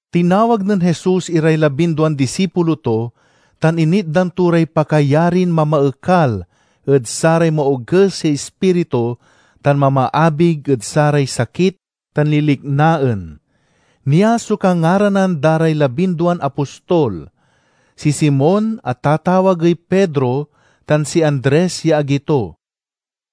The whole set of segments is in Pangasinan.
Tinawag nen Jesus iray labinduan disipulo to, tan initdan to ray pakayarin mamaekal ed saray maoges ya ispiritu tan mamaabig ed saray sakit tan liliknaen. Nia so kangaranan da ray labinduan apostol: si Simon a tatawagey Pedro tan si Andres ya agi to;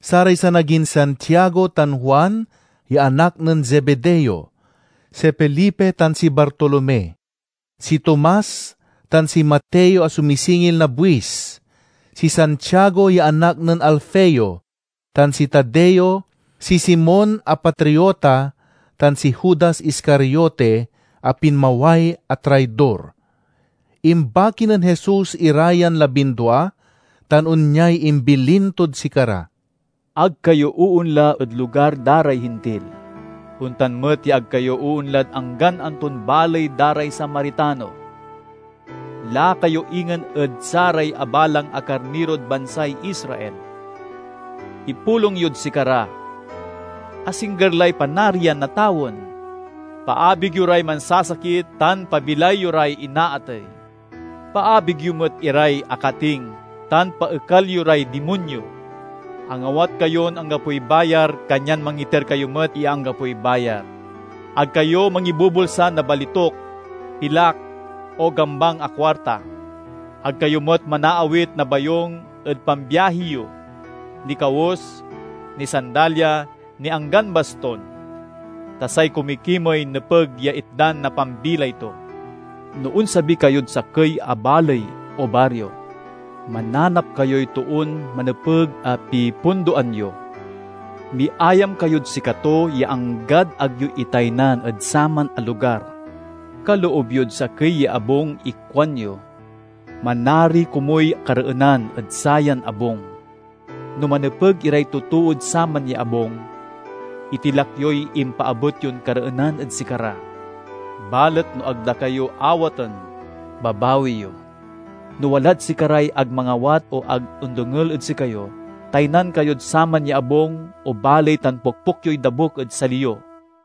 saray sanagin Santiago tan Juan ya anak nen Zebedeo; si Felipe tan si Bartolome; si Tomas, tan si Mateo a sumisingil na buis; si Santiago ya anak nen Alfeo, tan si Tadeo; si Simon a Patriota, tan si Judas Iscariote a pinmaway a traidor. Imbaki nen Jesus ira yan labindua tan onyay imbilin tod sikara: "Ag kayo oonla ed lugar da ray Hintil; ontan met ya ag kayo oonlad anggan anton baley da ray Samaritano. Laka yo ingen ed saray abalang a karnirod bansay Israel. Ipulong yod sikara, 'Asingger lay Panarian na tawen!' Paabig yo ray mansasakit tan pabilay yo ray inaatey. Paabig yo met iray akating tan paekal yo ray dimonyo. Angawat kayon anggapoy bayar, kanyan mangiter kayo met ya anggapoy bayar. Ag kayo mangibubulsa na balituk, pilak, o gambang a kuarta. Ag kayo met manaawit na bayung ed pambiahi yo, ni kawes, ni sandalya, ni anggan baston. Ta say kumikimey nepeg ya itdan na pambilay to. "No onsabi kayod sakey a baley o bario, mananap kayoy toon manepeg a pipundoan yo; miayam kayod sikato ya anggad ag yo itaynan ed saman a lugar. Kaloob yod sakey ya abung ikuanyo, 'Manari komuy kareenan ed sayan abung!' No manepeg iray totood saman ya abung, itilak yoy impaabet yon kareenan ed sikara; balet no ag da kayo awaten, babawi yo. No walad sikaray ag mangawat o ag ondengel ed sikayo, taynan kayod saman ya abung o baley tan pokpok yoy dabuk ed sali yo.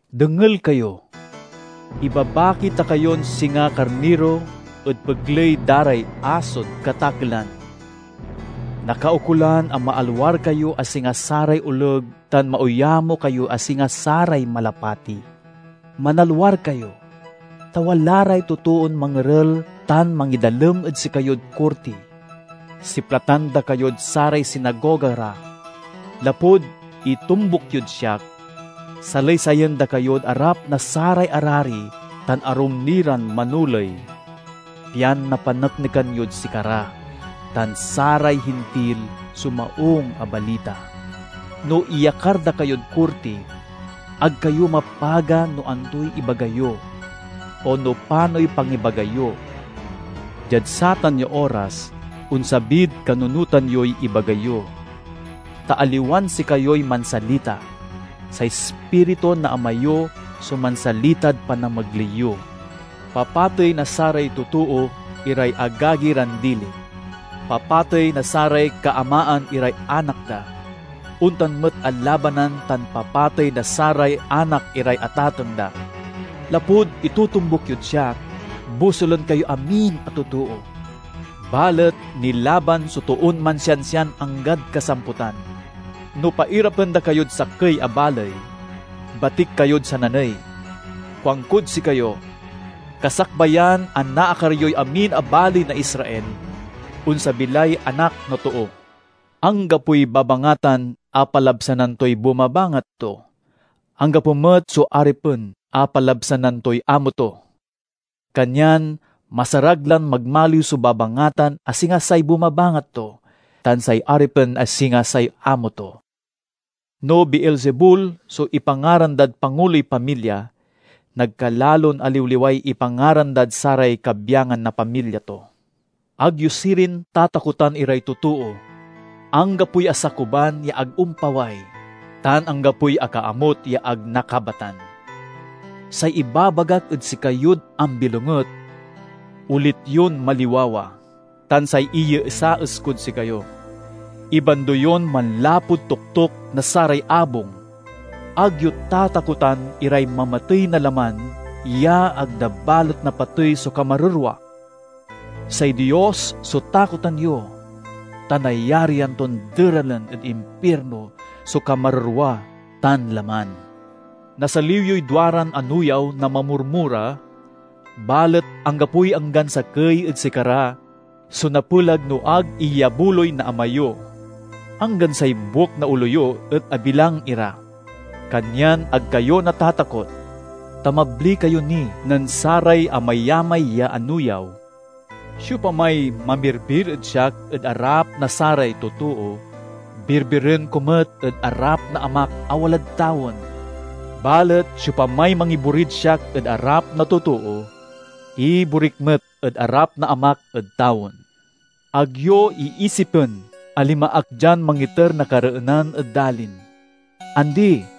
"Dengel kayo! Ibabaki ta kayon singa karniro ed pegley da ray asod katakelan. Nakaukolan a maalwar kayo a singa saray oleg tan mauyamo kayo a singa saray malapati. Manalwar kayo, ta wala ray totoon mangerel tan mangidalem ed sikayod korti. Siplatan da kayod saray sinagoga ra. Lapud itombuk yod siak, salaysayen da kayod arap na saray arari tan arum ni ran manoley, pian napaneknekan yod sikara ran saray Hintil so Maung a Balita. No iyakar da kayod korti, ag kayo mapaga no antoy ibaga yo, o no panoy pangibaga yo. Diad satan ya oras, onsabid kanunotan yoy ibaga yo. Ta aliwan sikayoy mansalita; say Ispiritu na Ama yo so mansalitad panamegley yo. "Papatey na saray totoo iray agagi ran dili. Papatey na saray kaamaan iray anak da; ontan met a labanan tan papatey na saray anak iray atateng da. Lapud itotombuk yod siak, bosulen kayoy amin a totoo. Balet nilaban so toon mansiansian anggad kasamputan. No pairapen da kayod sakey a baley, batik kayod sananey. Kuankod sikayo: kasakbayan a naakar yoy amin a baley na Israel, onsabi lay Anak na Too. "Anggapoy babangatan a palabsanan toy bumabangat to; anggapo met so aripen a palabsanan toy amo to. Kanyan masarag lan magmaliw so babangatan a singa say bumabangat to, tan say aripen a singa say amo to. No Beelzebul so ipangaran dad panguloy pamilya; nagkalalon aliwliway ipangaran dad saray kabyangan na pamilya to!" "Ag yo sirin tatakotan iray totoo. Anggapoy asakuban ya ag ompaway, tan anggapoy akaamut ya ag nakabatan. Say ibabagak ed sikayod ambilonget, olit yon maliwawa; tan say iyeesaes kod sikayo, ibando yon manlapud toktok na saray abung. Ag yo tatakotan iray mamatey na laman ya ag da balet napatey so kamarerwa. Say Dios so takotan yo, ta nayarian ton deralen ed impirno so kamarerwa tan laman. Nasaliw yoy duaran anuyaw na mamurmura, balet anggapoy anggan sakey ed sikara so napelag no ag iyabuloy na Ama yo. Anggan say buek na olo yo et abilang ira. Kanyan ag kayo natatakot, ta mabli kayo ni nen saray amayamay ya anuyaw!" "Siopamay mamirbir ed siak ed arap na saray totoo, birbiren ko met ed arap na Amak a walad tawen. Balet siopamay mangiborid siak ed arap na totoo, iborik met ed arap na Amak ed tawen." "Ag yo iisipen a linma ak dian mangiter na kareenan ed dalin. Andi!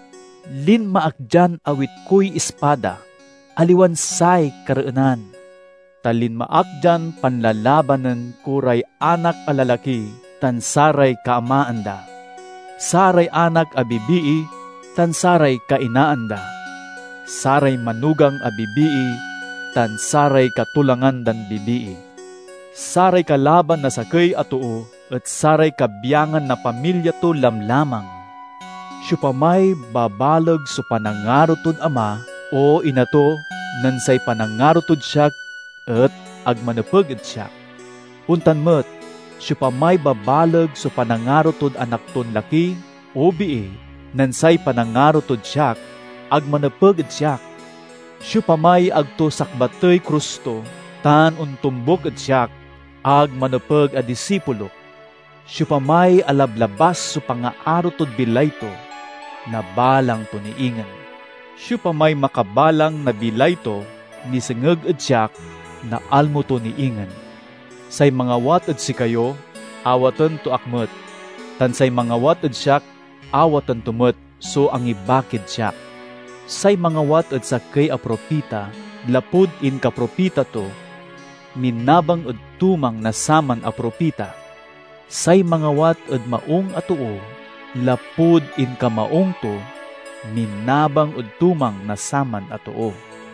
Linma ak dian awit koy ispada, aliwan say kareenan. Ta linma ak dian panlalabanen ko ray anak a lalaki tan saray kaamaan da, saray anak a bibii tan saray kainaan da, saray manugang a bibii tan saray katolangan dan bibii. Saray kalaban na sakey a too et saray kabyangan na pamilya to lamlamang. "Siopamay babaleg so panangaro tod ama o ina to nen say panangaro tod siak et ag manepeg ed siak. Ontan met, siopamay babaleg so panangaro tod anak ton laki o bii nen say panangaro tod siak, ag manepeg ed siak. Siopamay ag to sakbatey krus to tan ontombuk ed siak, ag manepeg a disipulok. Siopamay alablabas so pangaaro tod bilay to, nabalang to ni ingen; siopamay makabalang na bilay to nisengeg ed siak, naalmo to ni ingen." "Say mangawat ed sikayo awaten to ak met, tan say mangawat ed siak awaten to met so angibakid siak. Say mangawat ed sakey a propita, lapud inkapropita to, minabang ed tumang na saman a propita. Say mangawat ed maung a too, lapud inkamaung to, minabang ed tumang na saman a too.